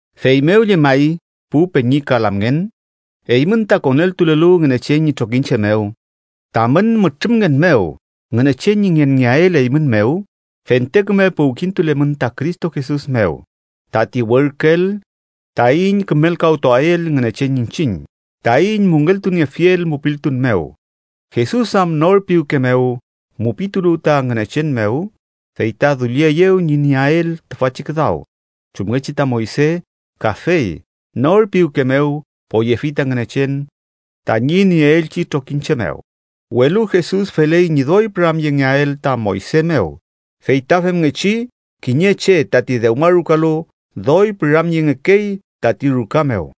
Feymew llemay, pu peñi ka lamngen, eymün ta koneltulelu Ngünechen ñi trokiñche mew, tamün mütrümngen mew Ngünechen ñi ngenngeael eymün mew, fente küme puwkintulemün ta Cristo Jesus mew, tati werküel taiñ kümelkawtuael Ngünechen iñchiñ, taiñ müngeltuniefiel mupiltun mew. Jesus am nor piwke mew mupitulu ta Ngünechen mew, fey ta dullieyew ñi nieael tüfachi küdaw, chumngechi ta Moyse kafey nor piwke mew poyefi ta Ngünechen tañi nieelchi trokiñche mew. Welu Jesus feley ñi doy püramyengeael ta Moyse mew, fey ta femngechi kiñe che tati dewmarukalu doy püramyengekey tati ruka mew.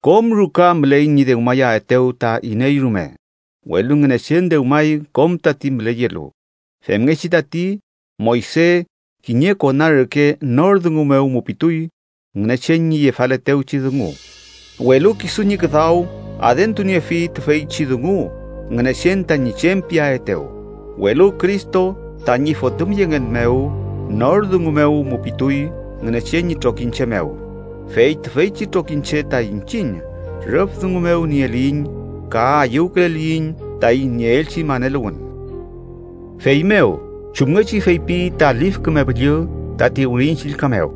Kom ruka müley ñi dewmayaetew ta iney rume, welu Ngünechen dewmay kom tati müleyelu. Femngechi tati, Moyse, kiñe kona reke, nor dungu mew mupituy Ngünechen ñi yefaletewchi dungu, welu kisu ñi küdaw adentuniefi tüfeychi dungu Ngünechen tañi chem piaetew. Welu Cristo tañi fotümyengen mew nor dungu mew mupituy Ngünechen ñi trokiñche mew. Fey tüfeychi trokiñche ta iñchiñ, rüf dungu mew nieliyiñ ka ayüwküleliyiñ taiñ nieelchi maneluwün. Feymew, chumngechi feypi ta Lif Küme Püllü tati Wirin Chillka mew: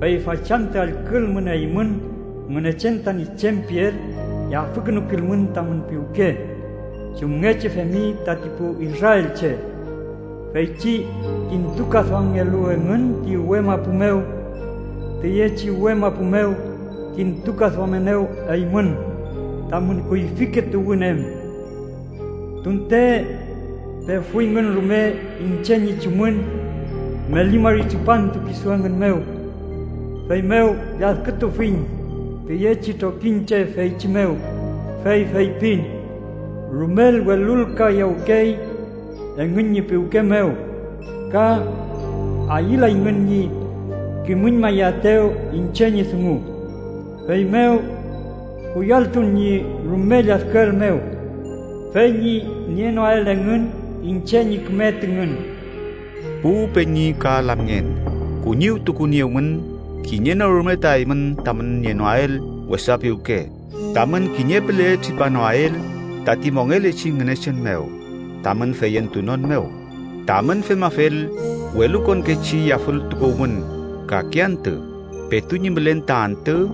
“Fey fachantü allkülmün eymün Ngünechen tañi chem piel, yafükünukilmün tamün piwke chumngechi femi tati pu israelche, feychi kintukaduamngelu engün ti uwe mapu mew. Tüyechi uwe mapu mew kintukaduamenew eymün tamün kuyfike tuwün em, tunte pefuyngün rume iñche ñi chumün meli mari tripantu kisu engün mew. Feymew lladkütufiñ tüyechi trokiñche feychi mew, fey feypin: Rumel welulkayawkey engün ñi piwke mew ka ayülayngün ñi kimüñmayaetew iñche ñi dungu. Feymew kuyalltun ñi rume lladküel mew, fey ñi nienoael engün iñche ñi küme tüngün.” Pu peñi ka lamngen, kuñiwtukuniewmün kiñe no rume ta eymün tamün nienoael wesa piwke tamün kiñe püle tripanoael tati mongelechi Ngünechen mew tamün feyentunon mew. Tamün femafel, welukonkechi yafültukuwmün kake antü, petu ñi mülen ta antü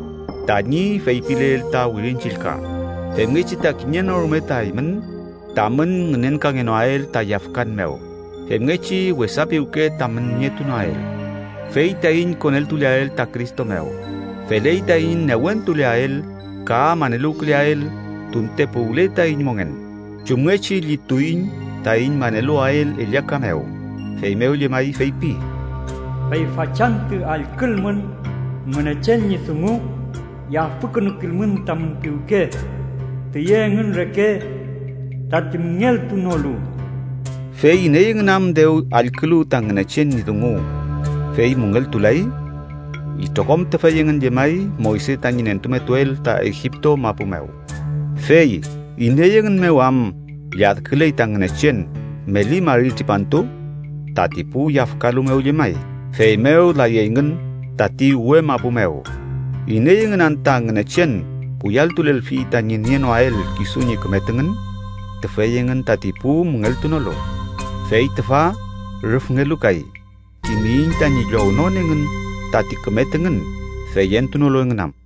tañi feypileel ta Wirin Chillka, femngechi ta kiñe no rume ta eymün tamün ngünenkangenoael ta yafkan mew femngechi wesa piwke tamün nietunoael. Fey taiñ koneltuleael ta Cristo mew, feley taiñ newentuleael ka maneluwküleael tunte puwle taiñ mongen chumngechi llituiñ taiñ maneluwael ellaka mew. Feymew llemay feypi: “Fey fachantü allkülmün Ngünechen ñi dungu, yafükünukilmün tamün piwke tüye engün reke tati müngeltunolu.” ¿Fey iney engün am dew allkülu ta Ngünechen ñi dungu, fey müngeltulay? Itrokom tüfey engün llemay Moyse tañi nentumetuel ta Egipto mapu mew. ¿Fey iney engün mew am lladküley ta Ngünechen meli mari tripantu? Tati pu yafkalu mew llemay, feymew layeyngün tati uwe mapu mew. ¿Iney engün anta Ngünechen kuyalltulelfi tañi nienoael kisu ñi küme tüngün? Tüfey engün tati pu müngeltunolu. Fey tüfa, rüfngelu kay, kimiyiñ tañi llownon engün tati küme tüngün feyentunolu engün am.